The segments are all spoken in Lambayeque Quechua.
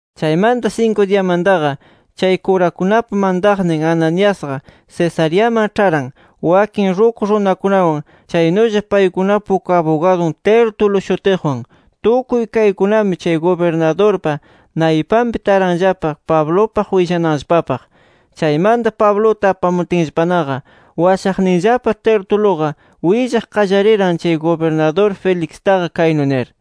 Chaymanta sinku diyamantaqa, chay kurakunapa mantaqnin Ananiasqa Cesareaman ĉharan wakin ruku runakunawan, chaynulla paykunapa uk abugadun Tértulo shutiqwan. Tukuy kaykunami, chay gubirnadurpa naypanpi taranllapa Pablupaq willananllapapaq. Chaymanta, Pabluta apamutinllapanaqa, washaqninllapa Tertuluqa willaq qallariran chay gubirnadur Felixtaqa kaynu nir: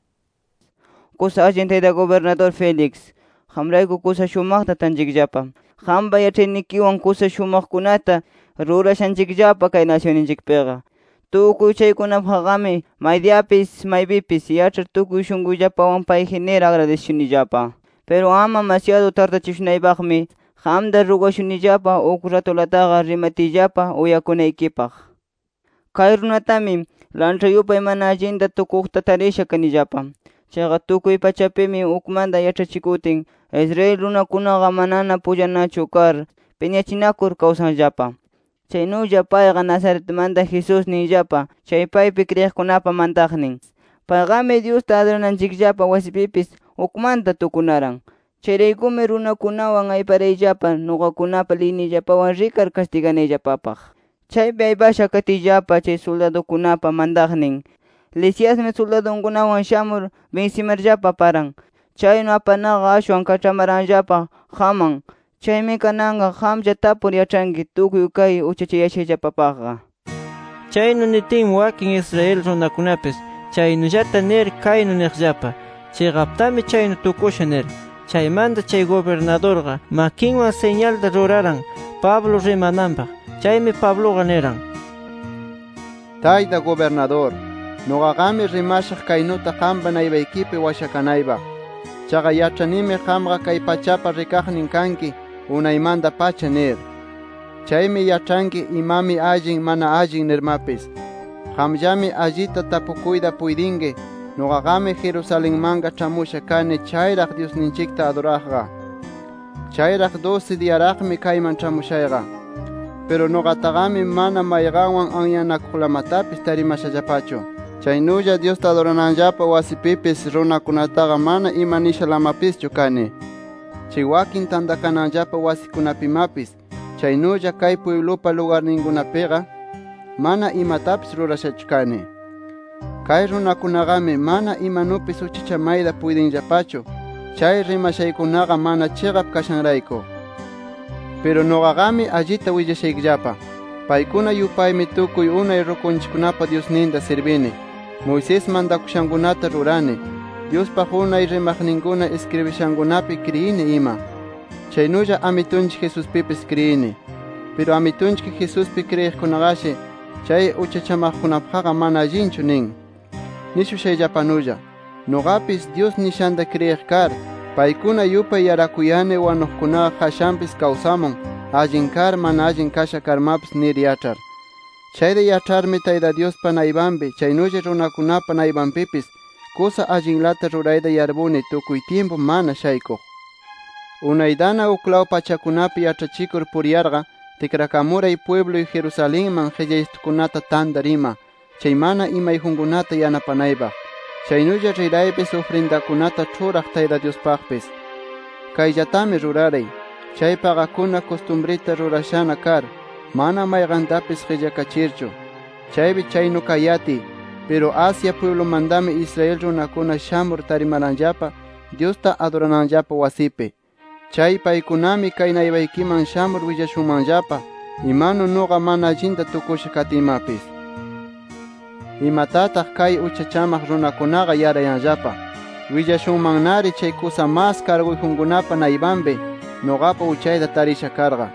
—Kusa allin tayta gubirnadur Félix, qamrayku kusa shumaqta tanchikllapa. Qampa yaĉhaynikiwan kusa shumaqkunata rurashanchikllapa kay nasyunninchikpiqa. Tukuy chaykunapaqqami maydiyapis, maypipis yaĉhar tukuy shunquyllapawan payji nir agradisishunillapa. Piru ama masyadu tardachishunaypaqmi, qamta rugashunillapa uk ratulataqa rimatiyllapa uyakunaykipaq. Kay runatami, lanĉha yupay mana allinta tukuqta tarisha kanillapa. Chaqa tukuy pachapimi, ukmanta yaĉhachikutin Israel runakunaqa manana pullanachu kar, piñachinakur kawsanllapa. Chaynulla payqa Nazaretmanta Jesús ninllapa chay paypi kriyiqkunapa mantaqnin. Payqami, Dyusta adurananchikllapa wasipipis ukmanta tukunaran. [Chayraykumi, runakunawan ayparayllapa nuqakunapa liyniyllapawan rikar kastiganayllapapaq. Chaypi aypasha katiyllapa, chay suldadukunapa mantaqnin Lisiasmi suldadunkunawan shamur binsimarllapa aparan. Chaynu aparnaqa ashwan kaĉhamaranllapa qamman.] Chaymi kananqa qamlla tapukur yaĉhanki tukuy kay uchachayashayllapapaqqa. Chaynu nitinmi, wakin Israel runakunapis chaynullata nir kaynu niqllapa: “Chiqaptami chaynu tukusha” nir. Chaymanta chay gubirnadurqa, makinwan siñalta ruraran Pablo rimananpaq. Chaymi Pabluqa niran: —Tayta gubirnadur. Nuqaqami rimashaq kaynuta qampa naypaykipi washakanaypaq. Chaqa yaĉhanimi qamqa kay pachapa rikaqnin kanki unaymanta-pacha nir. Chaymi yaĉhanki imami allin, mana allin nirmapis. Qamllami allita tapukuyta puytinki, nuqaqami Jerusalenmanqa ĉhamusha kani chayraq Dyusninchikta aduraqqa. Chayraq dusi diyaraqmi kayman ĉhamushayqa. Piru nuqataqami, mana mayqanwan anyanakuqlamatapis tarimashallapachu. Chaynulla Dyusta adurananllapa wasipipis runakunataqa mana imanishalamapischu kani. Chay wakin tantakananllapa wasikunapimapis, chaynulla kay pwiblupa lugarninkunapiqa mana imatapis rurashachu kani. Kay runakunaqami, mana imanupis uchachamayta puytinllapachu, chay rimashankunaqa mana chiqap kashanrayku. “Piru nuqaqami allita willashaykillapa: Paykuna yupaymi tukuy unay rukunchikkunapa Dyusninta sirbini, Moisés mantakushankunata rurani, Dyuspaq unay rimaqninkuna iskribishankunapi kriyini ima. Chaynulla Amitunchik Jesuspipis kriyini. Piru Amitunchik Jesuspi kriyiqkunaqashi, chay uchachamaqkunapaqqa mana allinchu nin. Nishushayllapanulla nuqapis, Dyus nishanta kriyiq kar, paykuna yupay yarakuyani wanuqkunaqa qashanpis kawsamun, allin kar, mana allin kasha karmapis nir yaĉhar. Chayta yaĉharmi Tayta Dyuspa naypanpi, chaynulla runakunapa naypanpipis, kusa allinlata rurayta yarpuni tukuy tyimpu mana shaykuq. “Unaytana uklaw pachakunapi yaĉhachikur puriyarqa, tikrakamuray pwibluy Jerusalenman qillaysitukunata tantar ima, chay mana imayjunkunata yanapanaypaq. Chaynulla riraypis ufrindakunata ĉhuraq Tayta Dyuspaqpis. Kayllatami rurayaray, chay paqakuna kustumrita rurashana kar, mana mayqantapis qillakachirchu. Chaypi chaynu kayatiy, piru Asia pwiblumantami, Israel runakuna shamur tarimaranllapa Dyusta adurananllapa wasipi. Chay paykunami kay naypaykiman shamur willashunmanllapa, imanu nuqa mana allinta tukusha katiymapis. Imatataq kay uchachamaq runakunaqa yarayanllapa. Willashunmannari chay kusa mas karguyjunkunapa naypanpi nuqapa uchayta tarisha karqa.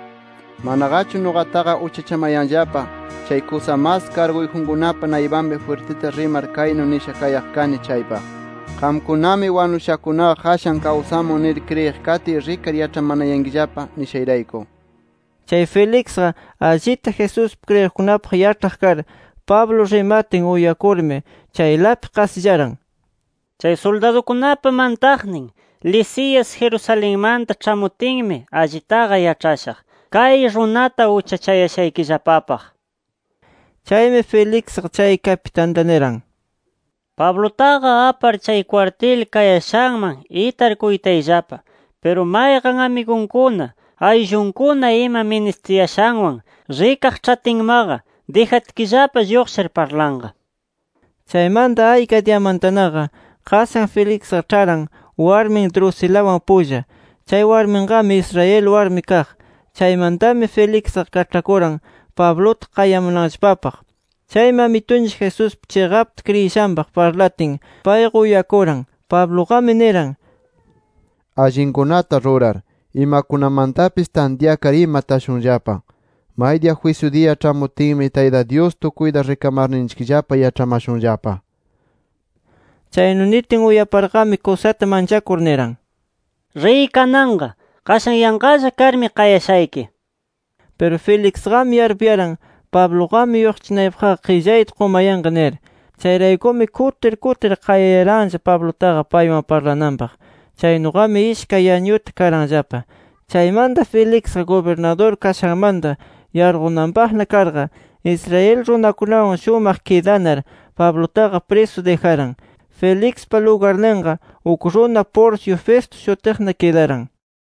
Manaqachu nuqataqa uchachamayanllapa chay kusa mas karguyjunkunapa naypanpi jwirtita rimar kaynu nisha kayaq kani chaypaq: ‘Qamkunami wanushakunaqa qashan kawsamun nir kriyiq katiy, rikar yaĉhamanayankillapa’ nishayrayku”. Chay Felixqa allita, Jesuspi kriyiqkunapaq yaĉhaq kar, Pablo rimatin uyakurmi chaylapi qasillaran, “Chay suldadukunapa mantaqnin Lisias Jerusalenmanta ĉhamutinmi allitaqa yaĉhashaq, kay runata uchachayashaykillapapaq” nir. Chaymi Felixqa, chay kapitanta niran: —Pablutaqa apar chay kwartil kayashanman itar kuytayllapa. Piru mayqan amigunkuna ayllunkuna ima ministiyashanwan rikaq ĉhatinmaqa, dijatkillapa lluqshir parlanqa. Chaymanta ayka diyamantanaqa, qashan Felixqa ĉharan warmin Drusilawan pulla. Chay warminqami Israel warmi kaq. Chaymantami Felixqa kaĉhakuran Pabluta qayamunanllapapaq. Chaymi Amitunchik Jesuspi chiqapta kriyishanpaq parlatin, payqa uyakuran. Pabluqami niran: “Allinkunata rurar, imakunamantapis tantyakar ima tashunllapa. Maydiya jwisyu diya ĉhamutinmi Tayta Dyus tukuyta rikamarninchikllapa yaĉhamashunllapa”. Chaynu nitin uyaparqami, kusata manchakur niran: —Riy kananqa. Qashan yanqalla karmi qayashayki nir. Piru Felixqami yarpuyaran: Pabluqami lluqshichinaypaqqa qillayta qumayanqa nir. Chayraykumi kutir, kutir qayayaranlla Pablutaqa, paywan parlananpaq. Chaynuqami ishkay añuta karanllapa. Chaymanta Felixqa gubirnadur kashanmanta yarqunanpaqna karqa, Israel runakunawan allinpi kidanar, Pablutaqa prisu dijaran. Felixpa lugarninqa, uk runa Porcio Festo shutiqna kidaran.